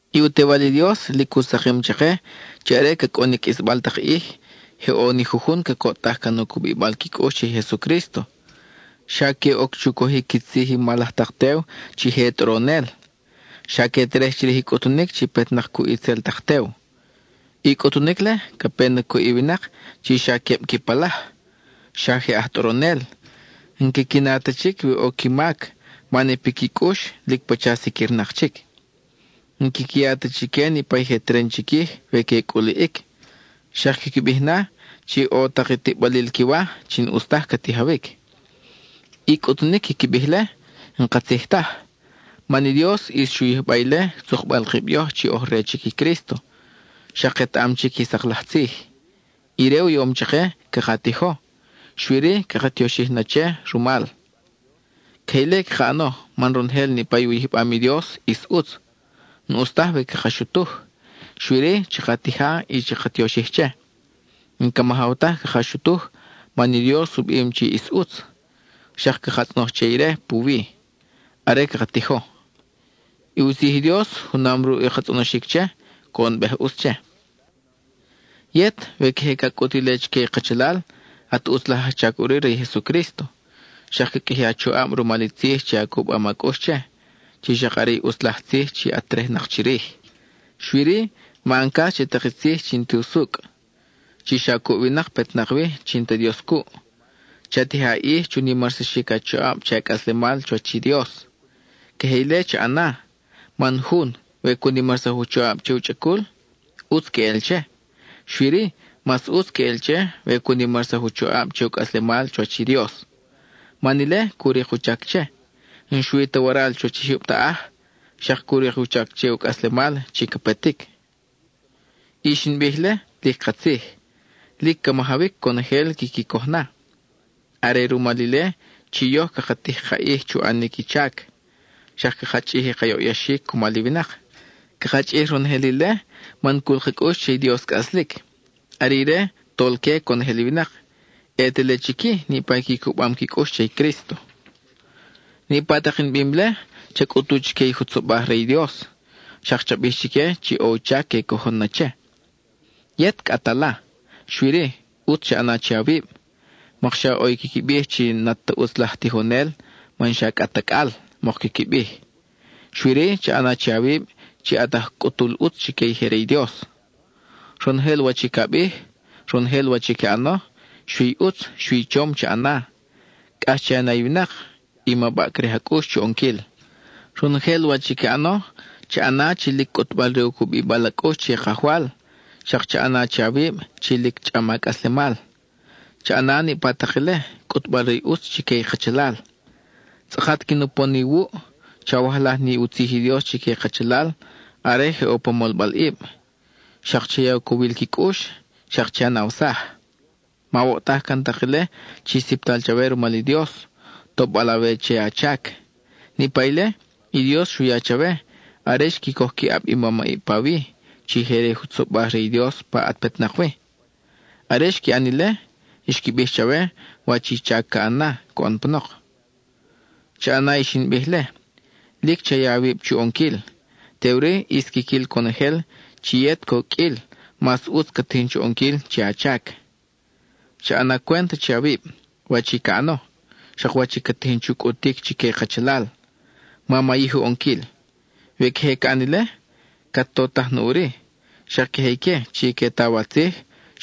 I u Tewal i Dios lic u sakim chake chi are ca cʼun i qʼuisbal tak ʼij, je ʼo ni jujun cacoʼtaj can u cubibal qui cʼux che i Jesucrísto. Xa que oc chu cojic qui tzij i mal laj tak tew chi je tʼoronel; xa que terej chirij i cʼutunic chi petnak cuʼ itzel tak tew. I cʼutunic-le, ca pe na cuʼ i winak chi xa queb qui palaj, xa je aj tʼoronel; n-quiqui na ta chic we ʼo qui mac man i piqui cʼux lic pacha siquirnak chic. N-quiqui ya ta chique niʼpa i je teren chiquij we que culiʼic, xak quiqui bij na chi ʼo tak i tiʼbalil qui wa chi n-ʼus taj ca tijawic. I cʼutunic quiqui bij-le, n-katzij taj, man i Dios ʼis xu yijba ile tzukbal kib yoj chi oj re chic i Crísto, xak ketaʼam chic i sak laj tzij. Ire u yom chake caka tijo, xui-ri, caka tioxij na che rumal. Queje ile caka ʼano man ronojel niʼpa u yijbam i Dios ʼis ʼutz, n-ʼus taj we caka xutuj; xui-ri, chaka tija y chaka tioxij che. (N-ca majaw taj caka xutuj, man i Dios u bim chi ʼis ʼutz, xak caka tzʼonoj che ire puwi, are caka tijo.) I u tzij i Dios, junam ruʼ i ka tzʼonoxic che, coʼonbej ʼutz che. Yet, we queje ca cʼut ile chique i kachalal, at ʼutz laj ajchac ʼuri re i Jesucrísto, xak ca qʼuiji a choʼab rumal i tzij chi a cubam a cʼux che, chi xak are i ʼutz laj tzij chi at terejnak chirij. Xui-ri, ma ʼan cas che tak i tzij chi n-ti usucʼ, chi xa cuʼ i winak petnak wi chi n-ta Dios cuʼ. Cha tija a ʼij chu nimarsaxic a choʼab che a cʼaslemal chuwach i Dios. Queje ile cha ʼana, man jun, we cu nimarsaj u choʼab che u chʼacul, ʼutz queʼel che, xui-ri, mas ʼutz queʼel che we cu nimarsaj u choʼab che u cʼaslemal chuwach i Dios. Man ile cu rik u chac che, n-xui ta waral chuwach i jyub taʼaj, xak cu rik u chac che u cʼaslemal chi ca petic. I xin bij-le, lic katzij; lic ca majawic conojel quiqui coj na. Are rumal ile chi yoj caka tij ka ʼij chu ʼanic i chac, xak caka chʼij i ka yoʼyaxic cumal i winak. Caka chʼij ronojel ile man cul ka cʼux che i Dios cʼaslic. Are ire, Tolque conojel i winak, ʼe te le chic-i niʼpa i qui cubam qui cʼux che i Crísto. Niʼpa tak in bim-le, cha cʼutu chique i jutzobaj re i Dios, xak cha bij chique chi ʼo u chac que cojon na che. Yet cʼa at ala, xui-ri, ʼutz cha ʼana che awib, mokxa ʼo i quiqui bij chi n-at ta ʼutz laj tijonel man xa cʼa at acʼal, mok quiqui bij. Xui-ri cha ʼana che awib chi at aj cʼutul ʼutz chique i je re i Dios. Ronojel wach i ca bij, ronojel wach i ca ʼano, xui i ʼutz, xui i chom cha ʼana; cʼax che a na i winak, y ma baʼcrij a cʼux chu ʼonquil. Ronojel wach i ca ʼano, cha ʼana chi lic cʼutbal re u cubibal a cʼux che i Kajwal, xak cha ʼana che awib chi lic chʼam a cʼaslemal. Cha ʼana niʼpa tak ile, cʼutbal re i ʼutz chique i kachalal. Tzʼakat quin upon iwuʼ, chawajlaj ni u tzij i Dios chique i kachalal are je ʼo pa molbalʼib; xak cha ya u cowil qui cʼux, xak che a nawsaj. Mawoʼtaj can tak ile chi siptal chawe rumal i Dios, tobal awe che a chac. Niʼpa ile, i Dios xu ya chawe are xqui coj qui ʼab i mamʼib pawi, chi je re i jutzobaj re i Dios pa at petnak wi. Are xqui ʼan ile, xqui bij chawe wach i chac ca ʼan na coʼon panok. Cha ʼana i xin bij-le, lic cha ya awib chu ʼonquil, teʼuri ʼis quiquil conojel chi yet coqʼuil mas ʼutz cat tijin chu ʼonquil che a chac. Cha ʼana cwent che awib, wach i ca ʼano, xak wach i cat tijin chu cʼutic chique i kachalal; ma mayij u ʼonquil. We queje ca ʼan ile, cat totaj na ʼuri, xak queje ique chi que taw a tzij,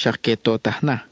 xak que totaj na.